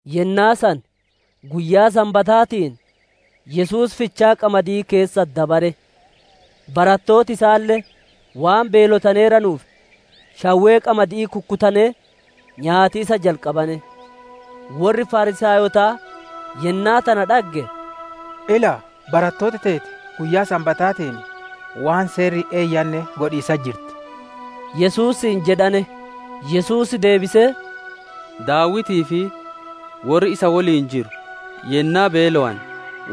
Yennaa san guyyaa Sanbataatiin Yesuus fichaa qamadi'ii keessa dabare; barattooti isaalle waan beelotaneeranuuf, shawwee qamadi'ii kukkutanee nyaatiisa jalqabane. Worri Fariisaayotaa yennaa tana dhagge, «Ilaa, barattooti teeti Guyyaa Sanbataatiin waan seerri hin eeyyanne godhiisatti jirti» Yesuusiin jedhane. Yesuus deebisee, «Daawitii fi worri isa woliin jiru yennaa beelowane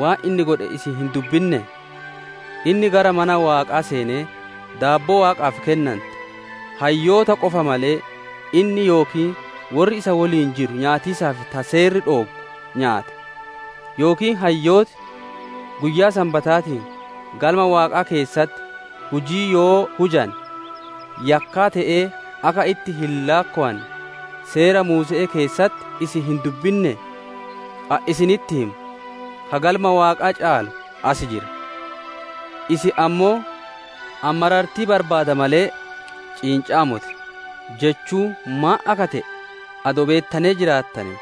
waan inni godhe isin hin dubbinnee? Inni gara mana Waaqaa seenee, daabboo Waaqa dura dhikaattu, hayyoota qofa malee, inni yookiin worri isa woliin jiru nyaatiisaaf ta Seerri dhooggu nyaate. Yookiin hayyooti Guyyaa Sanbataatiin Galma Waaqaa keessatti hujii yoo hujane, yakkaa te'ee akka itti hin laakkowanne, Seera Muuse'ee keessatti isin hin dubbinnee? Ani isinitti hima, ka Galma Waaqaa caalu as jira. Isin ammoo, ‹Ani marartii barbaada malee, ciinca'aa moti› jechuun maan akka te'e adoo beettanee jiraattanee,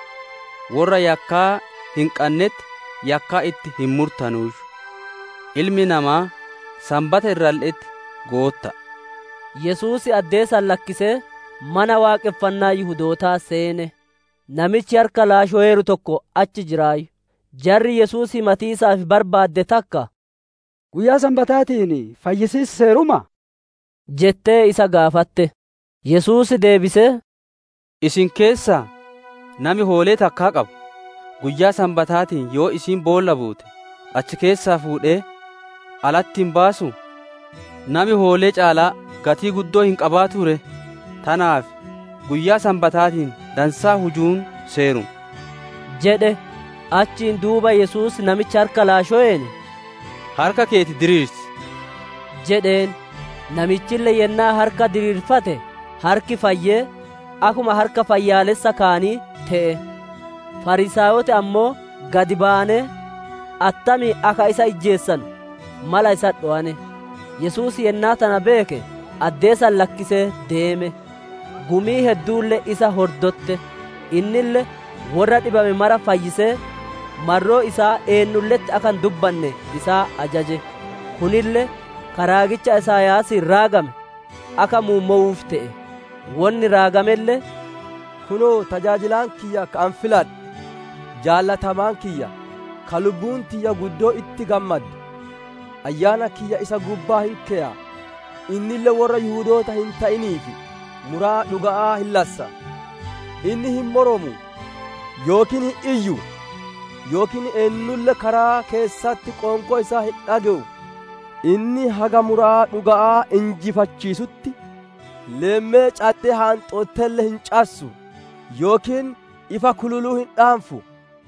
worra yakkaa hin qannetti yakkaa itti hin murtanuuyyu. Ilmi Namaa Sanbata irralle'etti Gootta'a» isaaniin jedhe. Yesuus addee san lakkisee Mana Waaqonfannaa Yihudootaa seene; namichi harka laashoweeru tokko achi jiraayyu; jarri Yesuus himatiisaaf barbaadde takka, «Guyyaa Sanbataatiin fayyisiis seerumaa?» jettee isa gaafatte. Yesuus deebisee, «Isin keessaa nami hoolee takkaa qabu, guyyaa Sanbataatiin yoo isiin boolla buute, achi keessaa fuudhee alatti hin baasuu? Nami hoolee caalaa gatii guddoo hin qabaatuu ree! Tanaaf guyyaa Sanbataatiin dansaa hujuun Seeruma» jedhe. Achiin duuba Yesuus namicha harka laashoween, «Harka keeti diriirsi» jedheen. Namichille yennaa harka diriirfate, harki fayyee, akkuma harka fayyaalessa kaanii te'e. Fariisaayoti ammoo gad bayanee, attamiin akka isa ijjeesanu mala isatti dhowane. Yesuus yennaa tana beeke, addee san lakkisee deeme. Gumiin hedduulle isa hordotte, innille worra dhibame mara fayyisee, marroo isaa eennulle'etti akka hin dubbanne isaan ajaje. Kunille ka raagicha Isaayaasiin raagame akka muummowuuf te'e. Wonni raagamelle, «Kunoo, tajaajilaan kiyya, ka ani filadhe, jaalatamaa kiyya, ka lubbuun tiyya guddoo itti gammadde. Ayyaana kiyya isa gubbaa hin keya, innille worra Yihudoota hin te'iniif muraa dhuga'aa hin lassa. Inni hin moromu yookiin hin iyyu, yookiin eennulle karaa keessatti qoonqoo isaa hin dhage'u. Inni haga muraa dhuga'aa injifachiisutti leemmee caddee haanxottelle hin cassu; yookiin ifa kululu hin dhaanfu.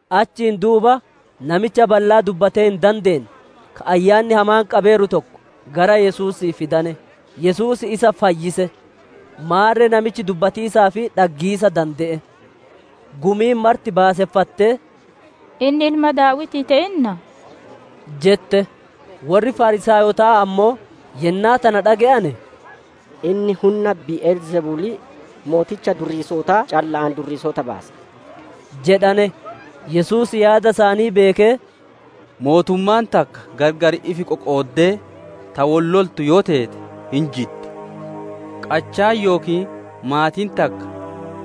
Achiin duuba namicha ballaa dubbatee hin dandeenne ka ayyaanni hamaan qabeeru tokko gara Yesuusii fidane; Yesuus isa fayyise, maarre namichi dubbatiisaa fi dhaggiisa dande'e. Gumiin marti baaseffattee, «Inni Ilma Daawitii te'innaa?» jette. Worri Fariisaayotaa ammoo yennaa tana dhage'ane, «Inni hunna Bi'el Zebulii mooticha durriisotaa calla'aan durriisota baasa» jedhane. Yesuus yaada isaanii beekee, «Mootummaan takka gargar ifi qoqooddee ta wol loltu yoo teete hin jiddi, qachaan yookiin maatiin takka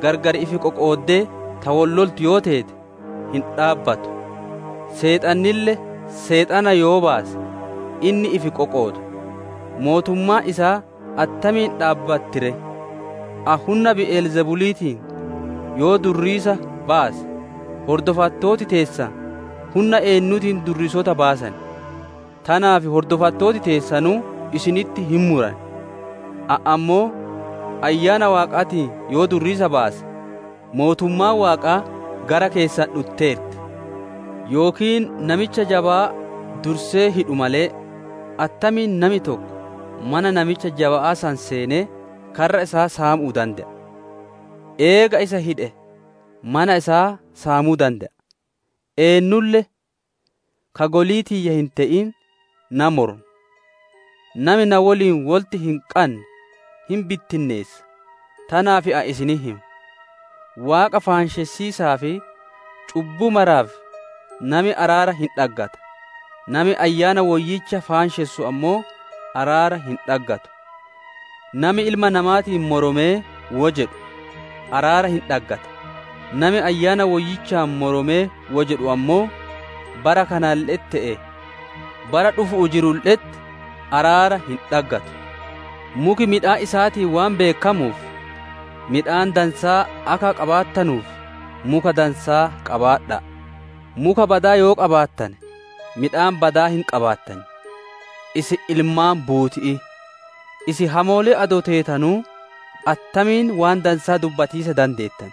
gargar ifi qoqooddee ta wol loltu yoo teete hin dhaabbatu. Seexannille Seexana yoo baase, inni ifi qoqooda; mootummaan isaa attamiin dhaabbatti ree? Ani hunna Bi'el Zebuliitiin yoo durriisa baase, hordofattooti teessan hunna eennuutiin durriisota baasan? Tanaaf hordofattooti teessanuu isinitti hin muran. Ani ammoo Ayyaana Waaqaatiin yoo durriisa baase, mootummaan Waaqaa gara keessan dhutteerti. «Yookiin namicha jabaa dursee hidhu malee, attamiin nami tokko mana namicha jaba'aa san seenee karra isaa saamuu dande'a? Eega isa hidhe mana isaa saamuu dande'a. Eennulle ka golii tiyya hin te'in na moroma, nami na woliin wolitti hin qanne hin bittinneessa. Tanaaf ani isinitti hima, Waaqa faanshessiisaa fi cubbuu maraaf nami araara hin dhaggata, nami Ayyaana Woyyicha faanshessu ammoo araara hin dhaggatu. Nami Ilma Namaatiin moromee wo jedhu araara hin dhaggata, nami Ayyaana Woyyichaan moromee wo jedhu ammoo, bara kanalle'etti te'ee bara dhufu'uu jirulle'etti araara hin dhaggatu. «Muki midhaan isaatiin waan beekkamuuf, midhaan dansaa akka qabaattanuuf, muka dansaa qabaadha'a; muka badaa yoo qabaattane midhaan badaa hin qabaattan. Isin ilmaan buuti'ii! Isin hamoolee adoo teetanuu, attamiin waan dansaa dubbatiisa dandeettan?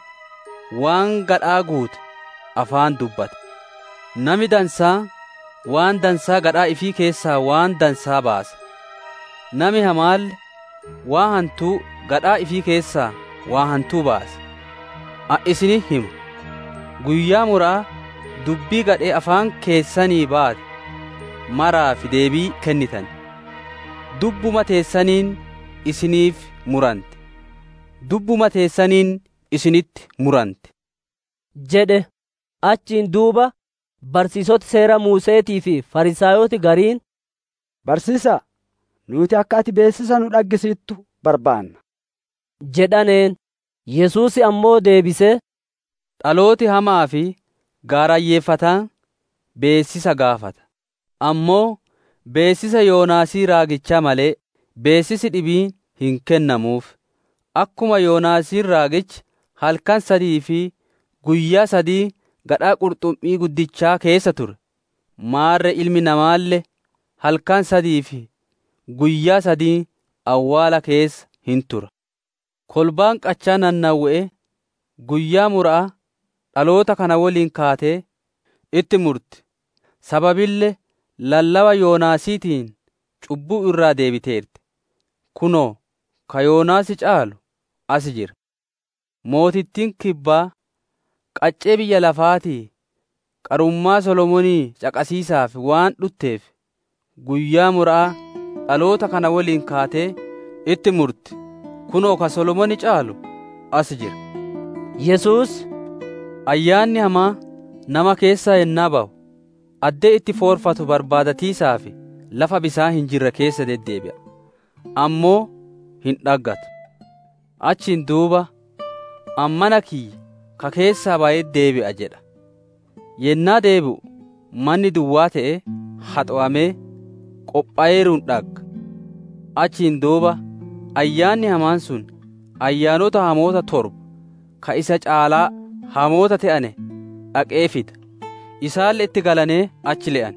Waan gadhaa guute afaan dubbata. Nami dansaan waan dansaa gadhaa ifii keessaa waan dansaa baasa; nami hamaalle waan hantuu gadhaa ifii keessaa waan hantuu baasa. Ani isinitti hima, guyyaa mura'aa dubbii gadhee afaan keessanii baate maraaf deebii kennitan; Dubbuma teessaniin isiniif muranti, dubbuma teessaniin isinitti muranti» jedhe. Achiin duuba barsiisoti Seera Muuse'eetii fi Fariisaayoti gariin, «Barsiisa'a, nuuti akka ati beessisa nu dhaggisiittu barbaanna» jedhaneen. Yesuus ammoo deebisee, «Dhalooti hama'aa fi gaarayyeeffataan beessisa gaafata, ammoo beessisa Yoonaasii raagichaa malee beessisi dhibiin hin kennamuuf. Akkuma Yoonaasiin raagichi halkan sadii fi guyyaa sadiin gadhaa qurxummii guddichaa keessa ture; maarre Ilmi Namaalle halkan sadii fi guyyaa sadiin awwaala keessa hin tura. Kolbaan qachaa Nanawwe'ee guyyaa mura'aa dhaloota kana woliin kaatee itti murti, sababille lallaba Yoonaasiitiin cubbuu irraa deebiteerti; kunoo, ka Yoonaas caalu as jira! Mootittiin kibbaa qaccee biyya lafaatii qarummaa solomoonii caqasiisaaf waan dhutteef, guyyaa mura'aa dhaloota kana woliin kaatee itti murti, kunoo ka Solomoon caalu as jira!» jedhe. Yesuus, «Ayyaanni hamaan nama keessaa yennaa bayu, addee itti foorfatu barbaadatiisaaf lafa bisaan hin jirre keessa deddeebi'a, ammoo hin dhaggatu. Achiin duuba, ‹Ani mana kiyya ka keessaa bayetti deebi'a› jedha. Yennaa deebi'u, manni duwwaa te'ee, haxowamee, qophoweeruun dhagga. Achiin duuba Ayyaanni hamaan sun Ayyaanota hamoota torba ka isa caalaa hamoota te'ane dhaqee fida; isaanille itti galanee achi le'an;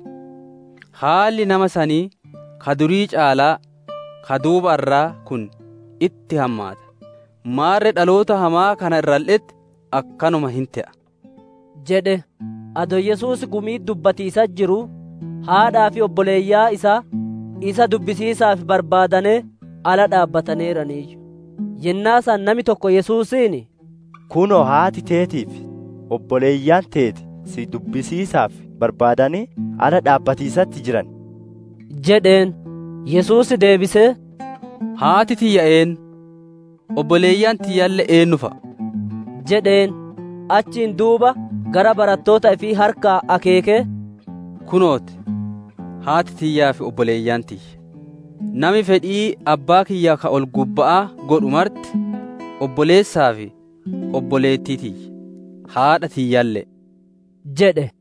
haalli nama sanii ka durii caalaa ka duubarraa kun itti hammaata. Maarre dhaloota hamaa kana irralle'etti akkanuma hin te'a» jedhe. Adoo Yesuus gumi'itti dubbatiisatti jiruu, haadhaa fi obboleeyyan isaa, isa dubbisiisaaf barbaadanee ala dhaabbataneeraniiyyu. [ Yennaa san nami tokko Yesuusiin, «Kunoo, haati teetii fi obboleeyyan teeti si dubbisiisaaf barbaadanee ala dhaabbatiisatti jiran» jedheen.] Yesuus deebisee, «Haati tiyyaa eennu, obboleeyyan tiyyalle eennu fa'a?» jedheen. Achiin duuba gara barattoota ifii harkaan akeekee, «Kunoo ti! Haati tiyyaa fi obboleeyyan tiyya! Nami fedhii Abbaa kiyya ka ol-gubba'aa godhu marti obboleessaa fi obboleettii tiyya, haadha tiyyalle'e» jedhe.